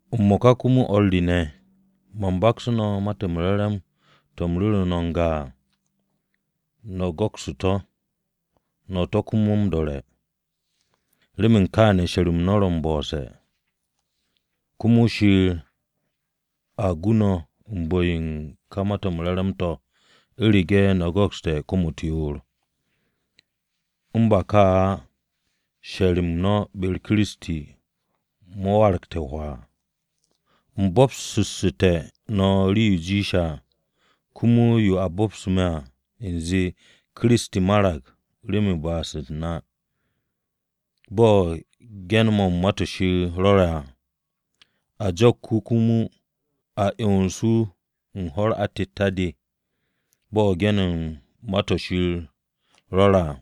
M-mo̱ka komo, o̱r re ne̱, man baksu̱ no̱ Ma-to̱ m-Re̱re̱m to̱ u̱m ru̱ru̱ no̱ n-ga à, no̱ go̱kstu̱ to̱, no̱ to̱ komo m-do̱re̱. Remen kaane̱ she̱r-m no̱ ro̱ m-bo̱se̱. Komo Shir a gu no̱ u̱n bu̱-yo u̱n ka Ma-to̱ m-Re̱re̱m to̱, u̱rege̱ no̱ go̱kste̱ kom-u̱t yoor. U̱n ba ka á, she̱r-m no̱ be-u̱r Kiristi mo̱ waragte̱ hwaa. U̱m bo̱bsu̱ssu̱te̱ no̱ rii-yo jiishe̱ à, komo yo a bo̱bsu̱ me̱ à, u̱nze: Kiristi marag remen ba'as-u̱t na, bo̱ ge̱n-mo̱ u̱n Ma-to̱ Shir rwo̱re̱ à. A jo̱k wu̱ komo a 'yons wu̱ u̱n ho̱-u̱r atette̱-de, bo̱ ge̱n-mo̱ u̱n Ma-to̱ Shir rwo̱re̱ à,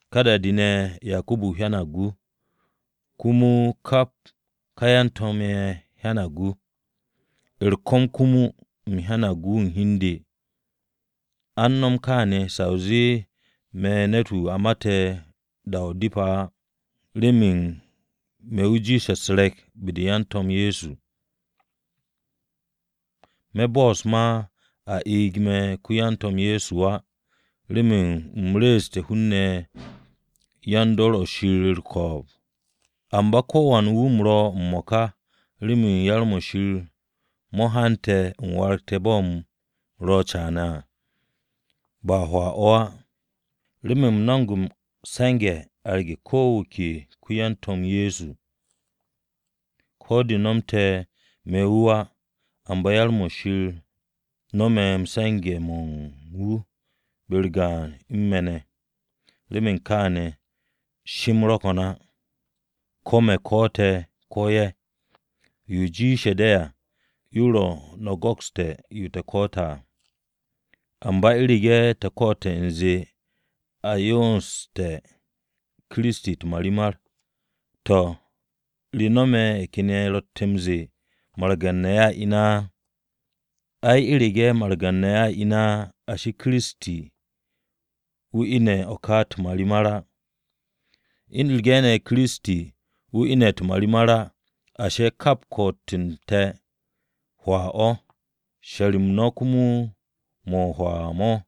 Ka da-de ne̱ Yakubu hyanag wu̱, komo kap ka yan-to̱m ye̱ hyanag wu̱. U̱r-ko̱m komo, u̱m hyanag wu̱ u̱n hi u̱n de, a u̱n nom kaane̱ sa o zee me̱ ne̱t-wu̱, wu̱ a mate̱ da-o̱ depe̱ á. Remen me̱ wu̱ jiishe̱ u̱s-re̱k be-de yan-To̱m Ye̱so, me̱ bo'os ma a eeg me̱ ko-yan-To̱m Ye̱so á, remen u̱m re̱e̱su̱te̱ hun-ne̱ yan-dor o̱ Shir u̱r-ko̱o̱b. Amba ko̱wan wu̱ u̱m ro̱ m-mo̱ka remen yar-mo̱ Shir mo̱ hante̱ u̱m waragte̱ bo̱ u̱m ro̱ caane̱ à, ba hwaa-o̱ á. Remen u̱m no̱mo̱g m-se̱nge̱ arge̱ ko̱ wu̱ ke ko-wan-To̱m Ye̱so wu̱. Ko̱ de nomte̱ me̱ wu̱ á, amba yar-mo̱ Shir no̱me̱ se̱nge̱-mo̱ u̱n wu̱ be-u̱r gaan u̱n me̱ ne̱. Remen kaane̱ she-m ro̱ ko̱n á, ko̱ me̱ ko̱'o̱te̱ ko̱ ye̱. Yo jiishe̱ de̱ à yo ro̱ no̱ go̱kste̱ yo te̱ ko̱'o̱te̱ à. Amba u̱rege̱ te̱ ko̱'o̱te̱ u̱nze a 'yonste̱ Kiristi u̱t-marimar, to̱ ¿re no̱me̱ ye̱ ken ye̱ ro̱tte̱ m-ze̱e̱ margan-ne̱ a ine̱ á? Ay, u̱rege̱ margan-ne̱ a ine̱ á, ashi, Kiristi wu̱ ine̱ o̱ ka u̱t-marimar á. U̱rege̱ ne̱ komo Kiristi wu̱ ine̱ u̱t-marimar á, ashi, kap ko̱'o̱t-m te̱, hwaa o̱. She̱r-m no̱ komo mo̱ o-hwaa mo̱.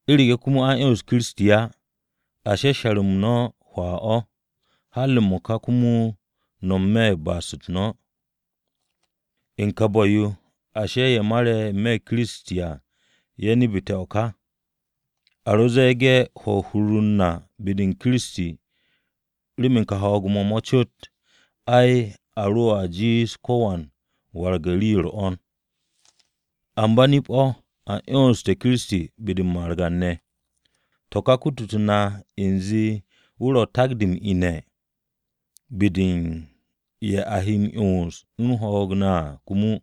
U̱rege̱ komo a 'yons Kiristi á ashi, she̱r-m no̱ hwaa-o̱, har m-mo̱ka komo no̱ n-me̱ u̱n ba'as-u̱t no̱. U̱n ka bu̱-yo, ashi, ye̱ mare̱ n-me̱ Kiristi à ye̱ nebete̱ o̱ ka. A ro̱ ze̱e̱ge̱ hwo̱ u̱n hur-u̱r na be-u̱r Kiristi remen kà ho̱o̱g-mo̱ mo̱ cot, ay, a roa jiish ko̱wan m-warag rii-yo u̱r-'wo̱n. Amba nip-o̱ a 'yonssu̱te̱ Kiristi be-de u̱n margan-ne̱. To̱ ka, kututu̱ na o̱ ka u̱nze wu̱ ro̱ takan-de m-ine̱ be-de u̱n ye̱ a he m-'yons u̱n ho̱o̱g ne̱ à komo.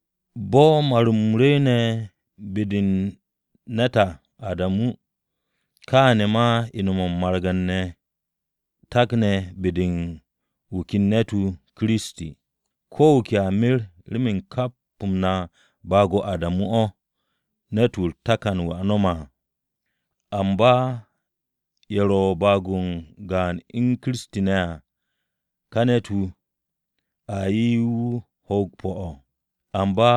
Bo̱ mar-m rwu̱u̱ne̱ be-de u̱n ne̱t à Adamu, kaane̱ ma ine̱-mo̱ u̱n margan-ne̱ takne̱ be-de u̱n wu̱ ken ne̱t-wu̱, Kiristi. Ko̱ wu̱ ke a mer remen kap na baag-o Adamu o̱ ne̱t-wu̱ a takne̱ m-no̱m à. Amba ye̱ ro̱ baag-o gaan u̱n Kiristi ne̱ à, wu̱ ka ne̱t-wu̱, a 'ye wu̱ ho̱o̱g pu̱-o̱. Amba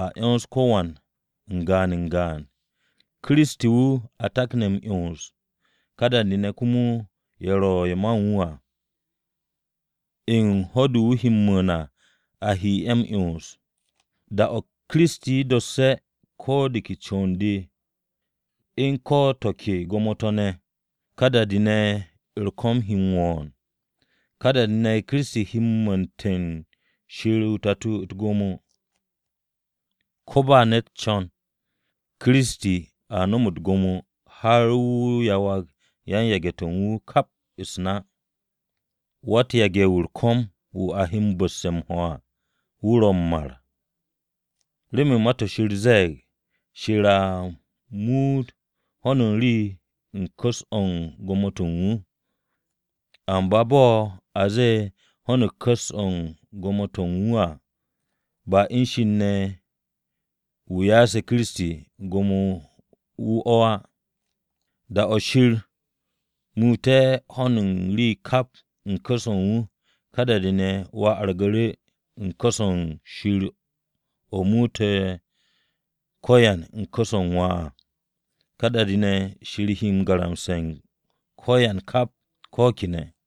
a 'yons ko̱wan n-gaan n-gaan. Kiristi wu̱ a takne̱ m-'yons, ká da-de komo ye̱ ro̱ ye̱ man wu̱ à u̱n ho̱-de wu̱ he m-mu̱u̱n à a he ye̱ m-'yons. Da-o̱ Kiristi dosse̱ ko̱ de ke con-de u̱n ko̱ to̱ ke gwo̱mo-to̱ ne̱, ka da-de ne̱ ko̱m-u̱r he m-wo̱o̱n, ka da-de ne̱ Kiristi he m-muute̱ u̱n Shir o-Tato u̱t-gwo̱mo. Ko̱ ba ne̱t u̱n co̱n, se̱ Kiristi no̱m u̱t-gwo̱mo har wu̱ yawag yan-yage̱-to̱ u̱n wu̱ kap u̱s-na. Wa-u̱t-yage̱-wu̱ u̱r-ko̱m wu̱ a he bu̱ste̱ m-ho̱ à wu̱ ro̱ m-mar. Remen Ma-to̱ Shir ze̱e̱g, “Shir a muut ho̱n u̱n rii u̱n ku̱s-o̱ u̱n gwo̱mo-to̱ u̱n wu̱.” Amba bo̱ a ze̱e̱, “Ho̱n u̱n rii u̱n ku̱s-o̱ u̱n gwo̱mo-to̱ u̱n wu̱” à, ba u̱n Shir ne̱ wu̱ ya'ase̱ Kiristi gwo̱mo-to̱ u̱n wu̱ o̱ á. Da-o̱ Shir muute̱ ho̱n u̱n rii kap u̱n ku̱s-o̱ u̱n wu̱, ka da-de, Wà wargu̱ru̱ u̱n ku̱s-o̱ Shir o̱ muute̱ ko̱yan u̱n ku̱s-o̱ u̱n Wà à. Ka da-de, Shir he m-garamse̱ u̱n ko̱yan kap, ko̱ kene̱.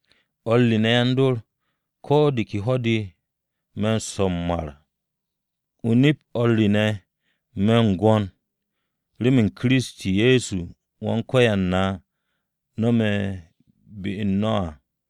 O̱r re ne̱ yan-dor, ko̱ de ke ho̱-de me̱ m-swo̱ m-mar. O-nip o̱r re ne̱, me̱ m-gwo̱n remen yo Kiristi Ye̱so Wan-Ko̱yan na no̱me̱ be-u̱r no̱ à.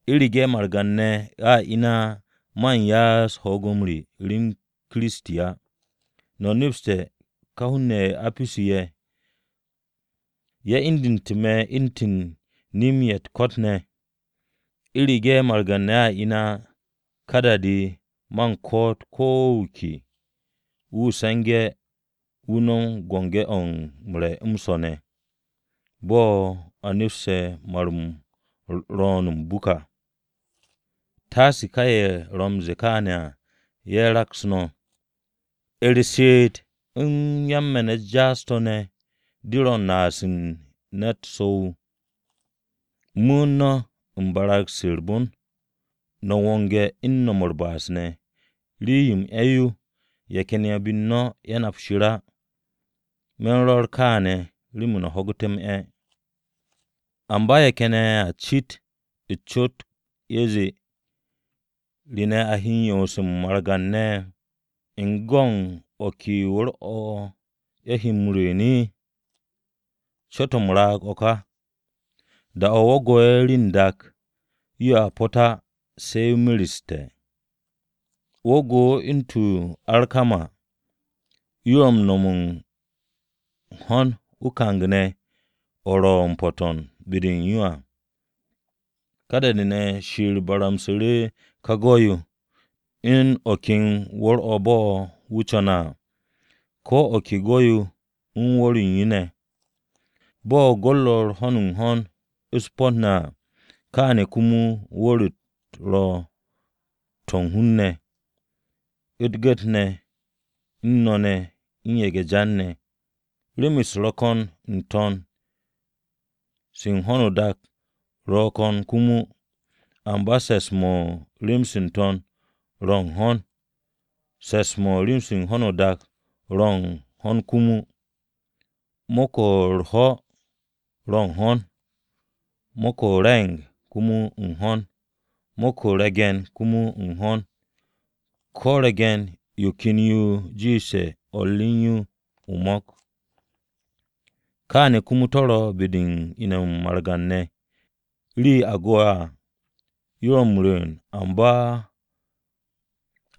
U̱rege̱ margan-ne̱ a ine̱ á, man ya'as ho̱o̱g-m re rem Kiristi á. No̱ nepste̱ ka hun-ne̱ ye̱ o-Apisu ye̱, ye̱ indu̱ndu̱te̱ me̱ u̱ntu̱n nem-ye̱ u̱t-ko̱t! U̱rege̱ margan-ne̱ a ine̱ á, ka da-de, man ko̱'o̱t ko̱ wu̱ ke wu̱, “Se̱ngu̱ no̱ no̱m u̱t-biki to̱ m-re̱ m-swo̱ ne̱, bo̱ a nepse̱ mar-m ro̱o̱n m-buk à.” Taase ka ye̱ ro̱ m-ze̱e̱ kaane̱ à ye̱ raks no̱! “U̱r-she'et u̱n yan-me̱n-u̱t jaas-to̱ ne̱ de ro̱ u̱n naas u̱n ne̱t so̱-wu̱.” Mu̱u̱n no̱ u̱n barag-se u̱r-bon, no̱ wonge̱ u̱n no̱m u̱r-ba'as ne̱. Rii-yo m-'e̱ yo ye̱ ken ye̱ be u̱n no̱ ye̱ nap Shir á. Me̱ u̱n rwo̱r to̱ ka remen no̱ ho̱gu̱te̱ m-'e̱. Amba ye̱ ken ye̱ a cit o-cot ye̱ zee, “¿Re ne̱ a he 'yons u̱n margan-ne̱? ¿U̱n go̱ u̱n o̱ ke wu̱r-o̱ ye̱ he m-rwu̱u̱n?” Cot-o̱ m-raag o̱ ka! Da-o̱ wo̱ go'e̱ rii n-dak, yoa pot á se̱ yo mereste̱. O-go̱, u̱ntu̱n yo o-arkama, yo ro̱ m-no̱m u̱n ho̱n o-kang ne̱ o̱ ro̱ m-po̱to̱n be-de u̱n yo à. Ka da-de, Shir baramsu̱ru̱ ka go̱-yo, u̱n o̱ ken wu̱r-o̱ bo̱ wu̱ co̱ne̱ à, ko̱ yo ke go̱-yo u̱n wu̱r-o̱ u̱n yo ne̱. Bo̱ go̱ ro̱ u̱n ho̱n u̱n ho̱n u̱s-po̱t ne̱ à: Kaane̱ o̱ komo wu̱r-u̱t ro̱ to̱ u̱n hun-ne̱, u̱t-gu̱t ne̱ u̱n no-ne̱ u̱n ye̱ge̱-jan-ne̱. Rem-u̱s ro̱ ko̱n n-to̱n, se u̱n ho̱no o-dak ro̱ ko̱n komo. Amba se̱ps-mo̱ u̱n rem-se n-to̱n ro̱ u̱n ho̱n, se̱ps-mo̱ u̱n rem-se u̱n ho̱no o-dak ro̱ u̱n ho̱n komo. Mo̱k-o̱ u̱r-ho̱ ro̱ u̱n ho̱n, mo̱k-o̱ o-re̱ng komo u̱n ho̱n, mo̱k-o̱ u̱n re̱ge̱n komo u̱n ho̱n. Ko̱ re̱ge̱n-yo ken yo ro̱ m-jiish u̱n o̱r re u̱n yo o-mo̱k. Kaane̱ komo to̱ ro̱ be-de u̱n ine̱-mo̱ u̱n margan-ne̱. Rii-yo a go̱'e̱ à yo ro̱ m-wu̱m,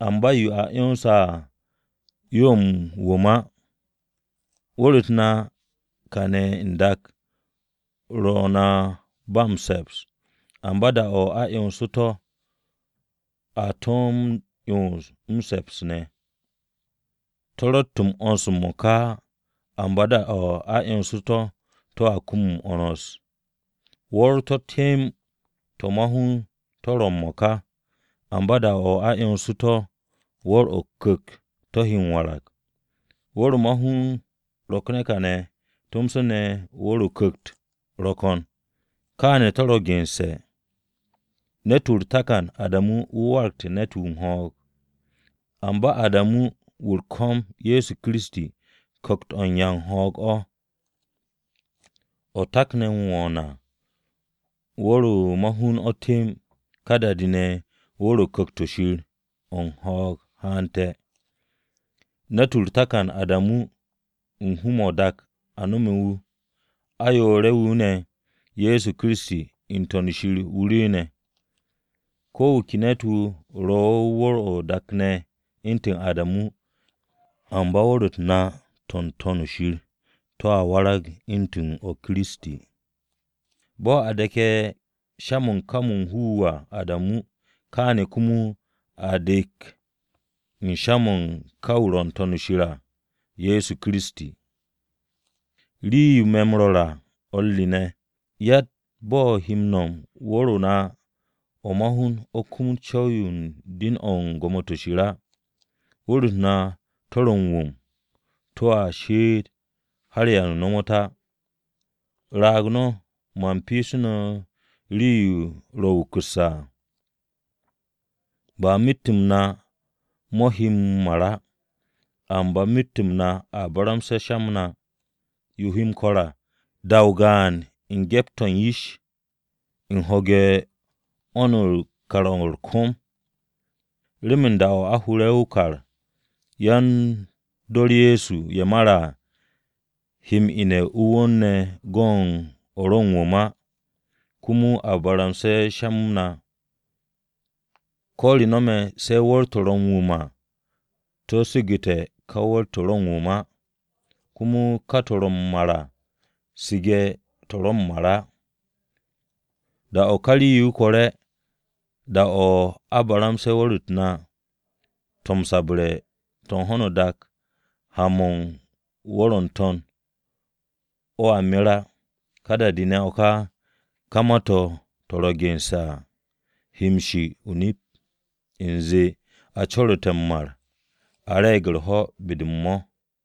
amba yo a 'yonse̱ à yo ro̱ m-wu̱m á. Wu̱r-u̱t na kane̱ n-dak ro̱ na ba m-se̱ps, amba da-o̱ a 'yonsu̱ to̱ a to̱ m-'yons m-se̱ps ne̱. To̱ ro̱tt m-'wo̱ns m-mo̱ka á. Amba da-o̱ a 'yonsu̱ to̱, to̱a kum m-'wo̱ns. Wu̱r-to̱ temb to̱ ma-hun to̱ ro̱ m-mo̱ka, amba da-o̱ a 'yonsu̱ to̱, wu̱r-to̱ o-ku̱kt to̱ he m-warag. Wu̱r-o̱ ma-hun rokne̱ kaane̱ tomso ne̱ wu̱r-o̱ o-ku̱kt ro̱ ko̱n. Kaane̱ to̱ ro̱ gense̱, “Ne̱t-wu̱ u̱r-takan, Adamu, wu̱ waragte̱ ne̱t-wu̱ u̱n ho̱o̱g.” Amba Adamu wu̱ u̱r-ko̱m Ye̱so Kiristi, Ku̱kt-o̱ o̱ u̱n 'ya u̱n ho̱o̱g o̱. O̱ takne̱ m-wo̱o̱n à, wu̱r-o̱ ma-hun o̱ temb, ka da-de, wu̱r-o̱ o-Ku̱kt o̱ Shir o̱ u̱n ho̱o̱g haante̱. Ne̱t-wu̱ u̱r-takan Adamu, u̱n hu-mo̱ n-dak a no̱me̱ wu̱. Ayoore̱-wu̱ ne̱, Ye̱so Kiristi n-To̱n shir wu̱ rwu̱u̱ne̱. Ko̱ wu̱ ke ne̱t-wu̱ ro̱ u̱n wu̱r-o̱ o-dak ne̱ u̱ntu̱n Adamu, amba wu̱r-u̱t na to̱ n-To̱n shir to̱a warag u̱ntu̱n o̱ ma Kiristi. Bo̱ a de̱ke̱ sha-mo̱ u̱n ká wu̱ m-hu wu̱ à Adamu, kaane̱ komo a he de̱k u̱n sha-mo̱ u̱n ka wu̱ n-To̱n shir wu̱, Ye̱so Kiristi. Rii-yo me̱ no̱ m-ru̱re̱ à o̱r re ne̱, yatt bo̱ he m-no̱me̱ wu̱r-o na o̱ ma-hun o̱ kumut m-co̱w u̱n den-o̱ u̱n gwo̱mo-to̱ Shir á. Wu̱r-u̱t na to̱ m-wu̱m to̱ to̱a she'et har da-o̱ ba m-ta á. Raag no̱ man pyeesu̱ no̱ rii-yo ro̱ wukusse̱ à! Ba myet-m na mo̱ he m-mar á, amba myet-m na a baramsusse̱ sha-m na. Yo he m-ko̱r à, da-o o-gaan, u̱n gyept-o̱ u̱n yish, u̱n ho̱ge̱ u̱n 'wo̱n-o̱ u̱n kar-o̱ u̱r-ko̱m. Remen da-o̱ a hure̱ o-kar, yan-dor Ye̱so ye̱ mare̱ à, he m-ine̱ o-wu̱r ne̱ go̱ u̱n o̱ ro̱ m-wu̱m á, komo a baramse̱ sha-m na. Ko̱ re no̱me̱, se̱ ká wu̱r-to̱ ro̱ m-wu̱m á to̱ su̱gu̱te̱ ká to̱ ro̱ m-wu̱m à, komo ka to̱ ro̱ m-mar á su̱ge̱ to̱ ro̱ m-mar à. Da-o̱ ka rii-yo kore̱ da-o̱ a baramse̱ wu̱r-u̱t na to̱ m-sabre̱ to̱ n-dak ha-mo̱ u̱n wu̱r-o̱ n-to̱n o̱a mer á, ka da-de, o̱ ká, ká ma-to̱ ro̱ gense̱ à he shi o-nip, u̱nze, “A co̱ru̱te̱ m-mar, a re̱e̱g u̱r-ho̱ be-de m-mo̱.”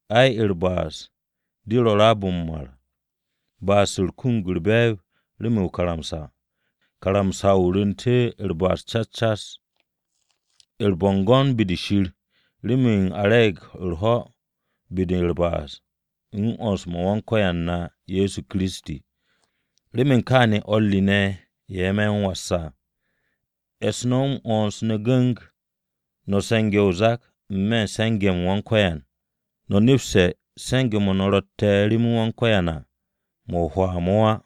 Ai, u̱r-ba'as de ro̱ raab-mo̱ m-mar. Ba'as-u̱r kumug u̱r-be̱e̱b remen o-karamsa. Karamsa-o̱ rwu̱nte̱ u̱r-ba'as cas cas. U̱r-bo̱ngo̱n be-de Shir remen a re̱e̱g u̱r-ho̱ be-de u̱r-ba'as u̱n 'wo̱ns-m Wan-Ko̱yan na Ye̱so Kiristi. Remen kaane̱ o̱r re ne̱ ye̱ me̱ m-was à, e̱s no̱ m-'wo̱ns ne̱ gu̱ng. No̱ se̱nge̱ o-zak n-me̱ u̱n se̱nge̱-m Wan-Ko̱yan, no̱ nepse̱ se̱nge̱-mo̱ no̱ rotte̱ rem Wan-Ko̱yan à mo̱ o-hwaa mo̱ á.